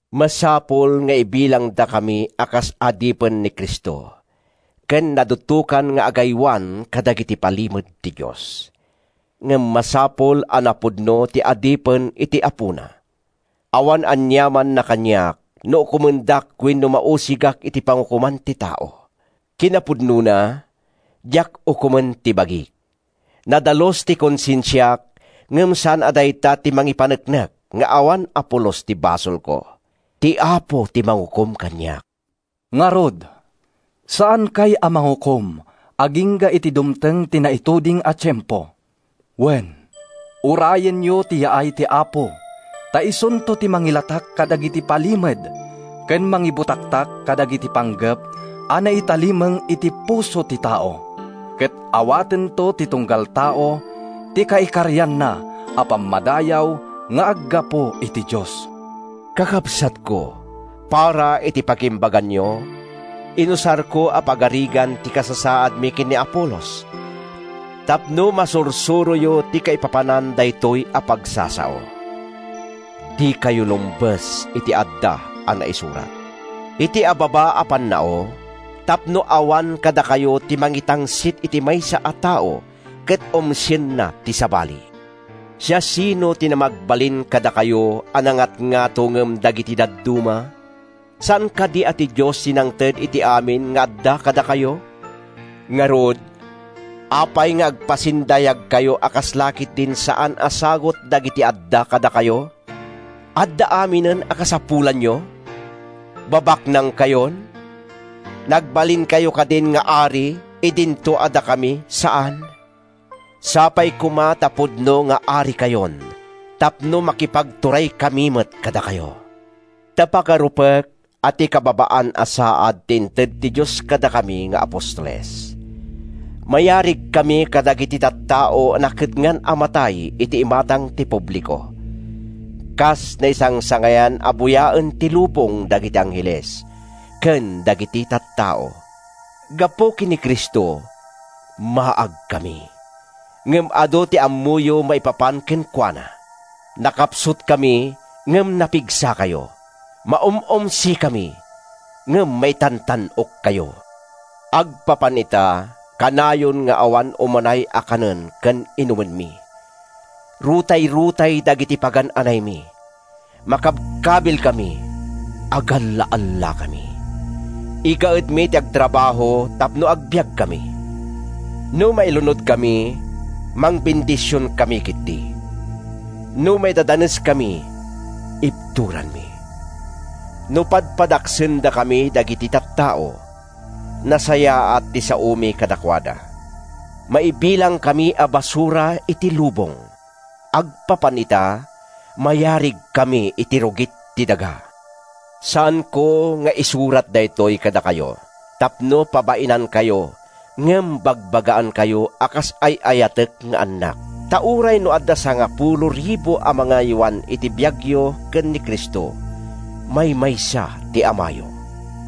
Masapul nga ibilangdakami a kas adipen ni Cristo ken nadutokan nga agaywan kadagiti palimed ti Dios. Ngem masapul a napudno ti adipen iti apona. Awan aniamanna kaniak no ukomendak wenno mausigak iti pangukoman ti tao. Kinapudnona, diak ukomen ti bagik. Nadalus ti konsensiak ngem saan a dayta ti mangipaneknek nga awan a pulos ti basolko. Ti Apo ti mangukom kaniak. Ngarud, saankay a mangukom agingga iti dumteng ti naituding a tiempo. Wen, urayenyo ti yaay ti Apo ta isunto ti mangilatak kadagiti palimed ken mangibutaktak kadagiti panggep a naitalimeng iti puso ti tao. Ket awatento ti tunggal tao ti kaikarianna a pammadayaw nga aggapu iti Dios. Kakabsatko, para iti pagimbaganyo, inusarko a pagarigan ti kasasaadmi ken ni Apolos tapno masursuroyo ti kaipapanan daytoy a pagsasao, “Dikayo lumbes iti adda a naisurat.” Iti ababa a pannao, tapno awan kadakayo ti mangitangsit iti maysa a tao ket umsienna ti sabali. Siasino ti namagbalin kadakayo a nangatngato ngem dagiti dadduma? Saan kadi a ti Dios ti nangted iti amin nga adda kadakayo? Ngarud, apay nga agpasindayagkayo a kasla ketdin saan a sagut dagiti adda kadakayo? Adda aminen a kasapulanyo? Babaknangkayon? Nagbalinkayo kadin nga ari, idinto a dakami, saan? Sapay koma ta pudno nga arikayon tapno makipagturaykami met kadakayo. Ta pagarupek a ti kababaan a saad ti inted ti Dios kadakami nga apostoles. Mayarigkami kadagiti tattao a nakedngan a matay iti imatang ti publiko, kas naisangsangayan a buyaen ti lubong dagiti angheles ken dagiti tattao. Gapu ken ni Cristo, maagkami. Ngem adu ti ammoyo maipapan kenkuana. Nakapsutkami, ngem napigsakayo. Maum-umsikami, ngem maitantan-okkayo! Agpapan ita, kanayon nga awan umanay a kanen ken inumenmi; rutayrutay dagiti pagan-anaymi; makabkabilkami; agalla-allakami. Igaedmi ti agtrabaho tapno agbiagkami. No mailunodkami, mangbendisionkami ketdi. No maidadaneskami, ibturanmi. No padpadaksendakami dagiti tattao, nasayaat ti saomi kadakuada. Maibilangkami a basura iti lubong. Agpapan ita, mayarigkami iti rugit ti daga. Saanko nga isurat daytoy kadakayo tapno pabainankayo ngem bagbagaankayo a kas ay-ayatek nga annak. Ta uray no adda sangapulo ribu a mangaywan iti biagyo ken ni Cristo, maymaysa ti amayo.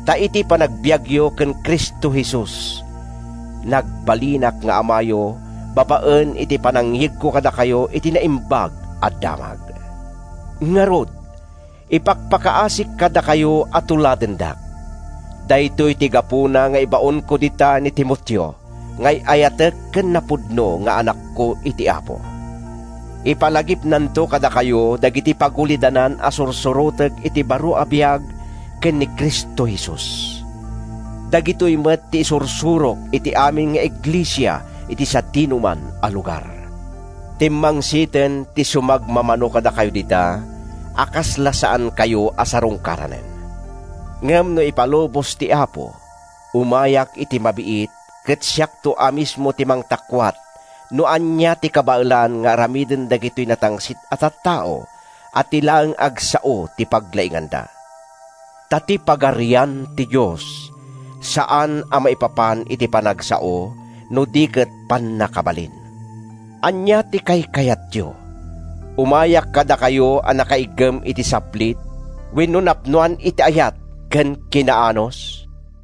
Ta iti panagbiagyo ken Cristo Jesus, nagbalinak nga amayo babaen iti panangyegko kadakayo iti Naimbag a Damag. Ngarud, ipakpakaasik kadakayo a tuladendak. Daytoy ti gapuna nga ibaonko dita ni Timoteo nga ay-ayatek ken napudno nga anakko iti Apo. Ipalagipnanto kadakayo dagiti pagulidanan a sursurotek iti baro a biag ken ni Cristo Jesus. Dagitoy met ti isursurok iti amin nga iglesia iti sadinoman a lugar. Timmangsiten ti sumagmamano kadakayo dita a kasla saankayo a sarungkaranen. Ngem no ipalubos ti Apo, umayak iti mabiit ket siakto a mismo ti mangtakuat no ania ti kabaelan nga aramiden dagitoy natangsit a tattao a ti laeng agsao ti paglainganda. Ta ti Pagarian ti Dios saan a maipapan iti panagsao no di ket pannakabalin. Ania ti kaykayatyo: Umayak kadakayo a nakaiggem iti saplit wenno napnoan iti ayat ken kinaanus?